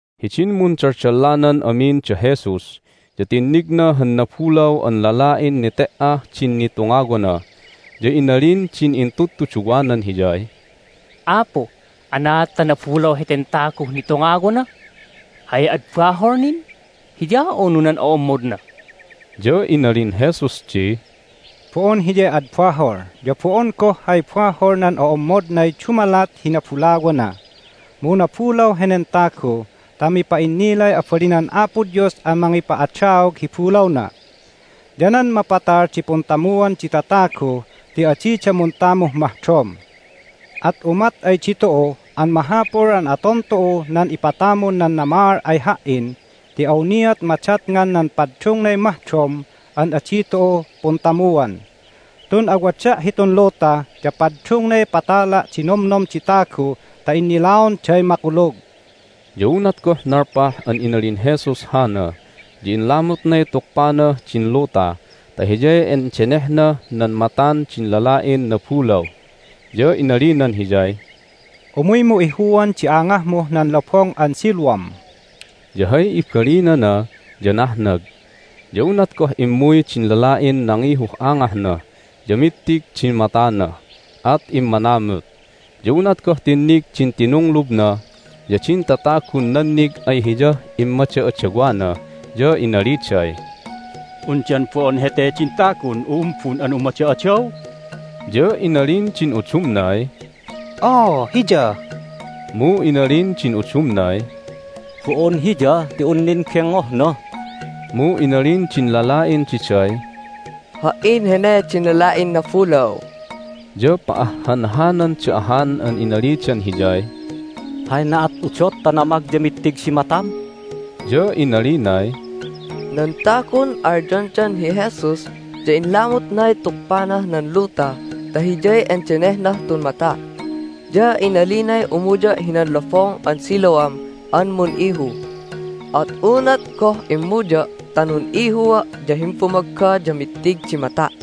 Hidin mundaldallanan amin da Jesus ya tinnigna han nabulaw an lala'in nete"ah din nitungawana. Ya inalimin din intudtuduwanan Hiyay, "Apu, anaad ta nabulaw heten taguh nitungawana? Hay ad bahol nin---hiya, unu nan o'ommodna?" Ya inalin Jesus di, "Bo'on hiyay ad bahol, ya bo'on goh hay bahol nan o'ommodnay dumalat hi nabulawana. Mu nabulaw henen tagu ta mipa'innilay abalinan Apo Dios an mangipa'adaog hi bulawna. Ya nan mapatal di puntamuan di tatagu ti adida muntamuh mahdom. At umat ay ditu'u an mahapul an aton tu'u nan ipatamun nan namaal ay Ha"in ti awniat madatngan nan paddungnay mahdom an adi tu'u puntamuan. Tun awada' hitun luta ya paddungnay patala' di nomnom di tagu ta innilaonday makulug." Ya unat goh nalpah an inalin Jesus hana ya inlamutnay tukpanah din luta ta hiyay indenehnah nan matan din lala'in nabulaw, ya inalinan hiyay, "Umuymu ihuan di angahmuh nan Lobong an Siloam" (ya hay ibalinana ya nahnag). Ya unat goh immuy din lala'in nangihuh angahna ya mittig din matana, at immanamut. Ya unat goh tinnig din tinunglubna ya din tatagun nannig ay hiyah immada'adawana ya inaliday, "Undan bo'on hete din tagun u'umbun an umada'adaw?" Ya inalin din udumnay, "Oo, hiya." Mu inalin din udumnay, "Bo'on hiya ti un nin gingngohna." Mu inalin din lala'in diday, "Ha"in hene din lala'in nabulaw." Ya pa'ahhanhananda ahan an inalidan hiyay, "Hay na'at udot ta namag ya mittig di matam?" Ya inalinay, "Nan tagun alyondan hi Jesus ya inlamutnay tukpanah nan luta ta hiyay endenehnah tun mata'. Ya inalinay umuya' hinan Lobong an Siloam an mun'ihu. At unat goh immuya' ta nun'ihua' ya himbumagga ya mittig di mata'."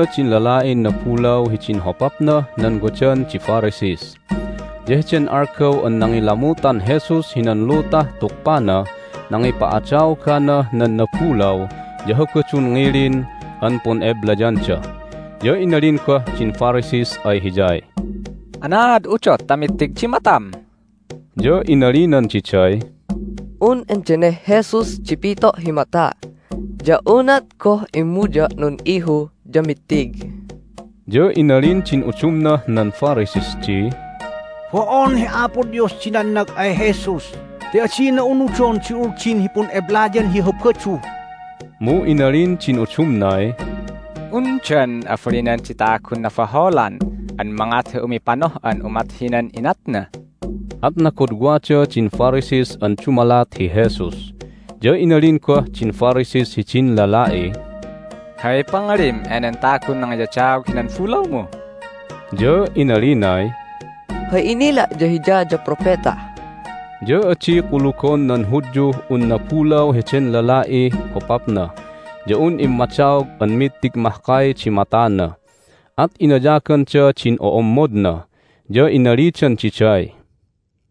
Inyuyda din lala'in nabulaw hidin hopapnah nan wadan di Pharisees. Ya heden algaw an nangilamutan Jesus hinan lutah tukpanah nangipa'adaoganah nan nabulaw ya Habadun ngilin an pun'eblayanda. Ya inalin goh din Pharisees ay hiyay, "Anaad udot ta mittig di matam?" Ya inalinan diday, "Un endeneh Jesus di pito' hi mata'. Ya unat goh immuya' nun'ihu ya mittig." Ya inalin din udumnah nan Pharisees di, "Bo'on hi Apo Dios di nannag ay Jesus ti adina unudon di Uldin hi pun'eblayan hi Habadu!" Mu inalin din udumnay, "Undan abalinan di tagun nabaholan an mangat hi umipanoh'an umat hinan inatna?" At nagodwada din Pharisees an dumalat hi Jesus. Ya inalin goh din Pharisees hidin lala'iy, "Hay pangalim enen tagun nangiyadaog hinan bulawmu?" Ya inalinay, "Hay inila' ya Hiya ya propeta." Ya adi kulugon nan Hudyuh un nabulaw heden lala'ih hopapna ya un immadaog an mittig mahkay di matana, at inayaganda din o'ommodna, ya inalidan diday,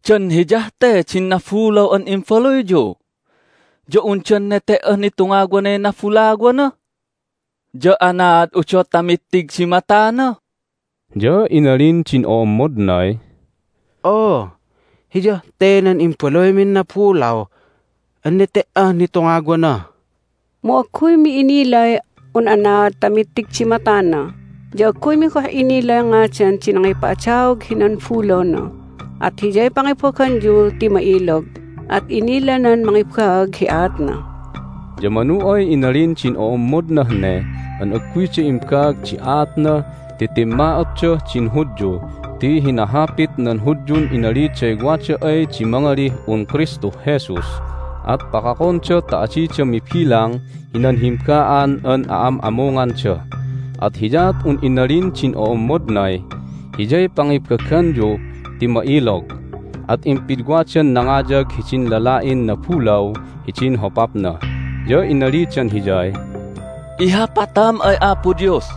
"Dan hiyah te din nabulaw an imbaluyyu? Ya undan nete"ah nitungawanay nabulawana? Ya anaad udot ta mittig di matana?" Ya inalin din o'ommodnay, "Oo, hiyah te nan imbaluymin nabulaw an nete"ah nitungawana. Mu agguymi inilay un anaad ta mittig di matana, ya agguymi goh inilay ngadan di nangipa'adaog hinan bulawna. At hiyay pangibaganyu ti ma'ilog, at inilanan mangibaag hi aatna!" Ya manu ay inalin din o'ommodnah ne an agguyda imbaag di aatna ti timma'otdah din Hudyu ti hinahapit nan Hudyun inaliday wada ay di mangalih un Kristuh Jesus at pakakonda ta adida mibilang hinan himba'an an a'ammunganda. At hiyaat un inalin din o'ommodnay, "Hiyay pangibaganyu ti ma'ilog!" At impidwadan nangayag hidin lala'in nabulaw hidin hopapna, ya inalidan hiyay, "Ihapatam ay Apo Dios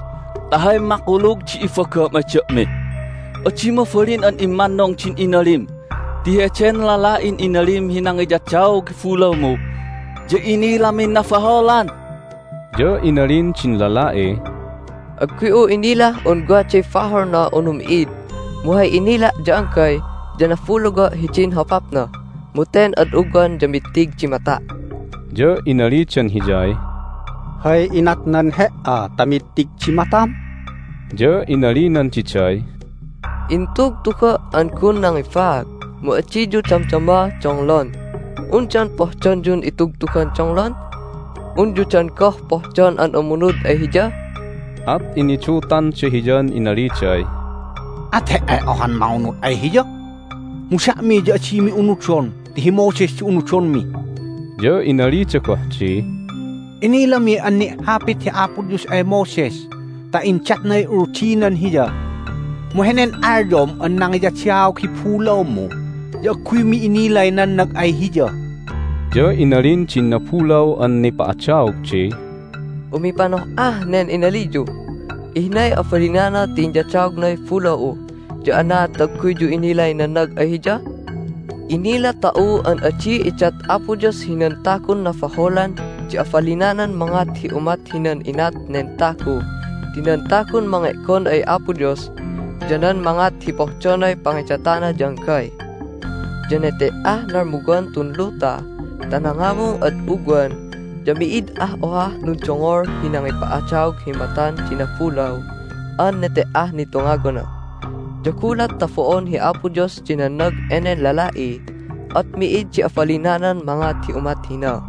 ta hay makulug di ibagam ay da'mi! Adi mabalin an immannung din inalim ti heden lala'in inalim hi nangiyadaog hi bulawmu ya inilamin nabaholan." Ya inalin din lala'iy, "Agguy'u inilah un waday baholna unu mi'id, mu hay inila' ya anggay ya nabulawa' hidin hopapna, mu ten ad ugwan ya mittig di mata'!" Ya inalidan hiyay, "Hay inatnan he"a ta mittig di matam?" Ya inalinan diday, "Intugtuga' an gun nangibaag, mu adiyu damdama donglon! Undan pohdonyun itugtugan donglon? Unyu dan goh pohdon an umunud ay Hiya?" At inidutanda hiyan inaliday, "At he"ay ohan mangunud ay Hiya! Mu da'mi ya adimi unudon ti hi Moses di unudonmi!" Ya inalida goh di, "Inilami an ni'hapit hi Apo Dios ay Moses ta indatnay Uldinan hiya, mu henen alyom an nangiyadaog hi bulawmu ya agguymi inilay nannag ay Hiya!" Ya inalin din nabulaw an nipa'adaog di, "Umipanoh'ah nen inaliyu! Ihnay abalinana ti inyadaognay bulaw'u, ya anaad ta agguyyu inilay nannag ay Hiya? Inila tu'u an adi idat Apo Dios hinan tagun nabaholan di abalinanan mangat hi umat hinan inat nen tagu ti nan tagun mange'gon ay Apo Dos ya nan mangat hi pohdonay pangidatana ya anggay. Ya nete"ah nalmuwan tun luta ta nangamung ad ugwan ya mi'id ah ohah nundongol hi nangipa'adaog hi matan di nabulaw an nete"ah nitungawana. Ya gulat ta bo'on hi Apo Dios di nannag enen lala'i at mi'id di abalinanan mangat hi umat hina!"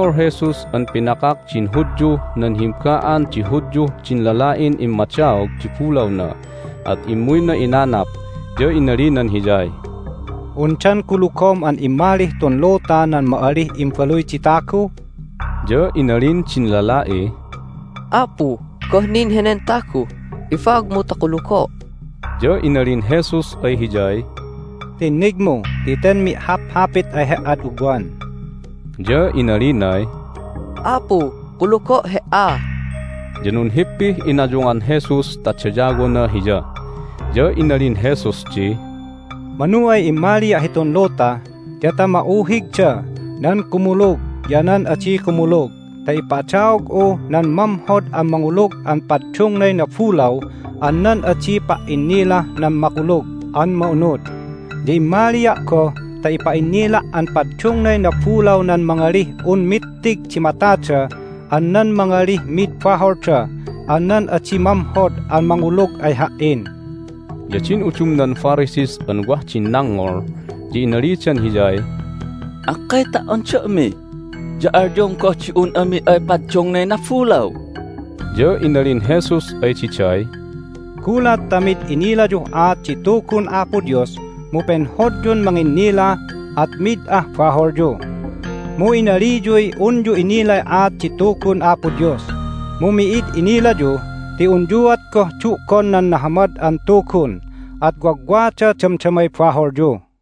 Dengngol Jesus an pinakak din Hudyuh nan himba'an di Hudyuh din lala'in immadaog di bulawna, at immuyna inanap, ya inalinan hiyay, "Undan kulugom an immalih tun luta nan ma'alih Imbaluy di Tagu?" Ya inalin din lala'iy, "Apu, goh nin henen tagu? Ibaagmu ta kulugo'!" Ya inalin Jesus ay hiyay, "Tinnigmu ti ten mi'haphapit ay he"ad ugwan." Ya inalinay, "Apu, kulugo' He"a!" Ya nunhippih inayungan Jesus ta dayawona Hiya. Ya inalin Jesus di, "Manu ay immalia' hitun luta ya ta ma'uhigda nan kumulug ya nan adi kumulug ta ipa'adaog'u nan mamhod an mangulug an paddungnay nabulaw an nan adi pa"innilah nan Makulug an Ma'unud. Ya immalia' goh ta ipa'innila' an paddungnay nabulaw nan mangalih un mittig di matada an nan mangalih mid baholda an nan adi mamhod an mangulug ay Ha"in." Ya din udumnan Pharisees an wah din nangngol ya inalidan Hiyay, "Akkay ta"on da'mi ya alyom goh di un ami ay paddungnay nabulaw?" Ya inalin Jesus ay diday, "Gulat ta mid inilayuh aat di Tugun Apo Dios mu penhodyun manginnila at mid ah baholyu. Mu inaliyuy unyu inilay aat di Tugun Apo Dios, mu mi'id inilayu ti unyuat goh du'gon nan Nahamad an Tugun, at wagwada damdamay baholyu."